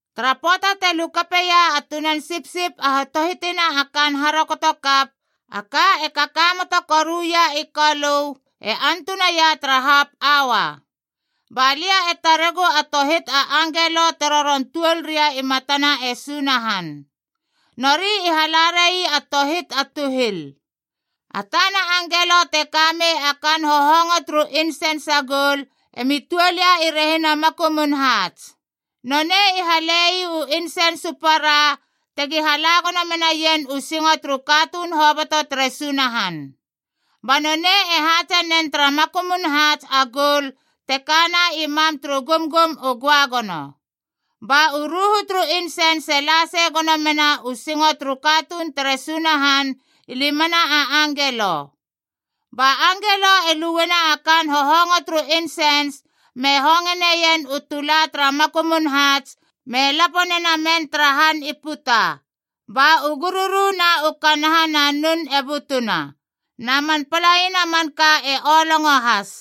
Tara pöata te lukapeia a Tunan Sipsip a hatohitina a kaan harokotokap, a ka e kakamoto koruia i Kolö, e antunaia tara hap aua. Ba lia e taregu a tohit a angelo te roron tuol ria i matana e Sunahan. Nori i hala rai a tohit a tuhil. A tana angelo te ka mei a kaan hohongo turu insens a goul emi tuol ia i rehina makumun haats.a Nonei i hale ii u insens u para tegi hala gono menaien u singo turu katuun hoboto tere Sunahan. Ba nonei e haatse nen tara makumun haats a goul te kana i mam turu gumgum u göagono. Ba u ruhu turu insens e la sei gono mena u singo turu katuun tere Sunahan i limana a angelo. Ba angelo e lueiena a kaan hohongo turu insens me hongeneien u tulana tara makumun haats me lapo nena men tara han i puta. Ba u gururu na u kanaha na nun e butuna, na man palaina manka e olongo has.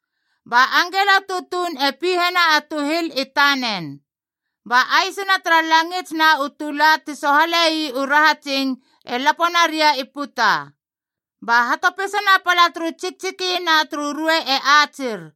Ba angelo tutuun e pihena a tuhil i tanen. Ba aisina tara langits na u tula ti sohale ii u rahatsing e lapo naria i puta. Ba hatopisana pala turu tsiktsiki na turu ruei e atsir.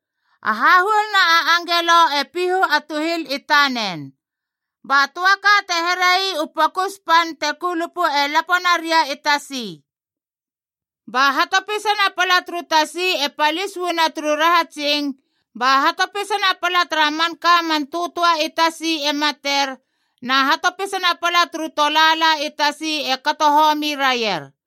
A hahuoluna a angelo e pihu a tuhil i tanen. Ba töa ka te here ii u pokus pan te kulupu e lapo naria i tasi. Ba hatopisana pala turu tasi e palis uana turu rahatsing, ba hatopisana pala tara manka man töatöa i tasi e mater, na hatopisana pala turu tolaala i tasi e kato homi raier.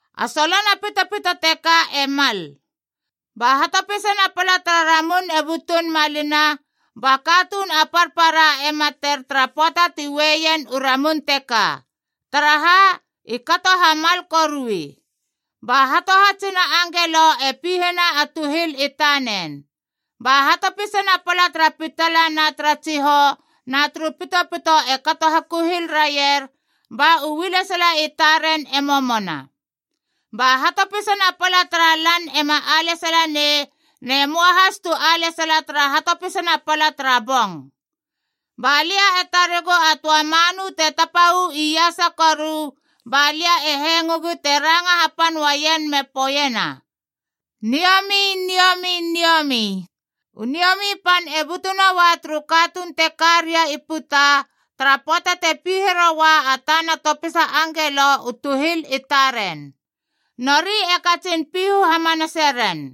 A solona pitopito teka e Mald. Ba hatopisana pala tara ramun e butun malina, ba katuun a parpara e mater tara pöata ti ueien u ramun teka. Taraha? I kato hamal korui. Ba hatohatsina angelo e pihena a tuhil i tanen. Ba hatopisana pala tara pitala na tara tsihou na turu pitopito e kato hakuhil raier, ba u ualesala i taren e momona. Ba hatopisana pala tara lan ema alesala nei, ne möa has tu ualesala tara hatopisana pala tara bong. Ba lia e taregu a töa manu te tapa uu iasa koru, ba lia e hengogu te ranga hapan uaien me poeiena, “Niomi, niomi, niomi. e U niomi pan e butu noa turu katuun te ka ria i puta tara pöata te pihe roua a tana topisa angelo u tuhil i taren. Nori e katsin pihu hamanaseren.”